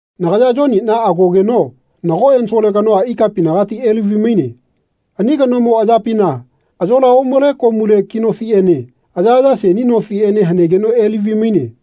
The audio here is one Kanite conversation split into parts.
Nagaya Yoniꞌna agogeno nago ensole kanoa ikapinagati elavi-maine. Ani kanomo ayapina ayola omale komule ki nofiꞌene ayaꞌaya seni nofiꞌene hanegeno elavi-maine.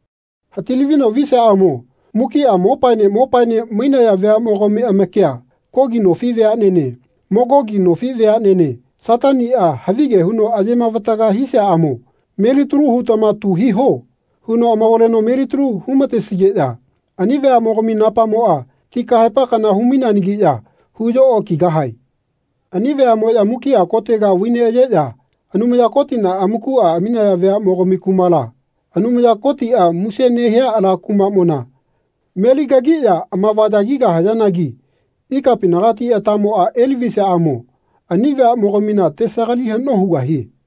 Hati-lavino visiaꞌamo mukiꞌa mopaene mopaene mainaya veaꞌmo-gami amakia Kogi nofi veaꞌnene Magogi nofi veaꞌnene Sataniꞌa havige huno aye-mavataga hisiaꞌamo “Melitalu hutama tu hiho.” huno amavaleno melitalu hu-matesigeꞌya ani veaꞌmogami napamoꞌa ti kahaepa kana hu-maineanagiꞌya huyo okigahae. Ani veaꞌmoꞌya mukiꞌa kotega vai neꞌayeꞌya Anumaya Kotina amakuꞌa aminaya veaꞌmogami kumala, Anumaya Kotiꞌa muse nehia ala kumaꞌmona meli kagiꞌya amavayagigahayanagi ikapinagati atamoꞌa elavisiaꞌamo ani veaꞌmogamina tesagali haꞌno hugahie.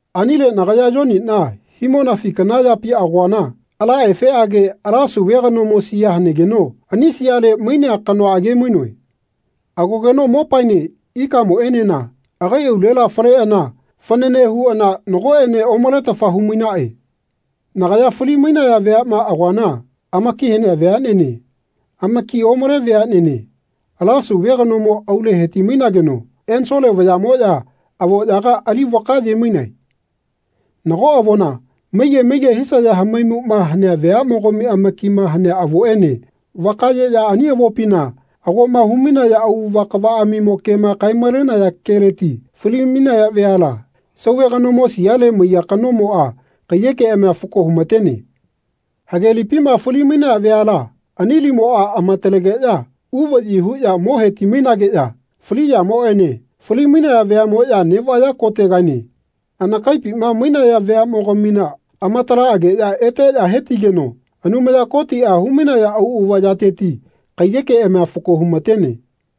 Anile nagaya Yoniꞌna himonafi kana yapi agoana ala efeꞌage ala Sauve kanomo sia hanegeno ani siale mainea kanoa age-mainoe. Agogeno mopamoꞌene ikaꞌmoꞌenena agai aulela faleꞌana fanane huꞌana nagoꞌene omaletafa humainaꞌe. Nagaya fali-mainaya veaꞌma agoana amaki hanea veaꞌnene, amakima omale veaꞌnene, ala Sauve kanomo aule heti-mainageno ensole vayaꞌmoꞌya avoꞌyaga ali vakaye-mainae. Nago avona, maige maige hisaya hamaimuꞌma hanea veaꞌmogami amakima hanea avoꞌene vakayeꞌya ani avopina agoꞌma humainaya auꞌava kavaꞌamimo kema kae-malenaya keleti fali-mainaya veala Sauve kanomo siale maiya kanomoꞌa kaiyekeꞌamia fako humatene. Hage lipima fali-mainaya veala ani limoꞌa amatalegeꞌya uvaꞌyi huꞌya mo heti-mainageꞌya fali yamoꞌene fali-mainaya veaꞌmoꞌya neꞌvaya kotegaene anakaipima mainaya veaꞌmogamina amatalaꞌageꞌya eteꞌya hetigeno Anumaya Kotiꞌa humainaya auꞌava yateti kaiyekeꞌamia fako humatene.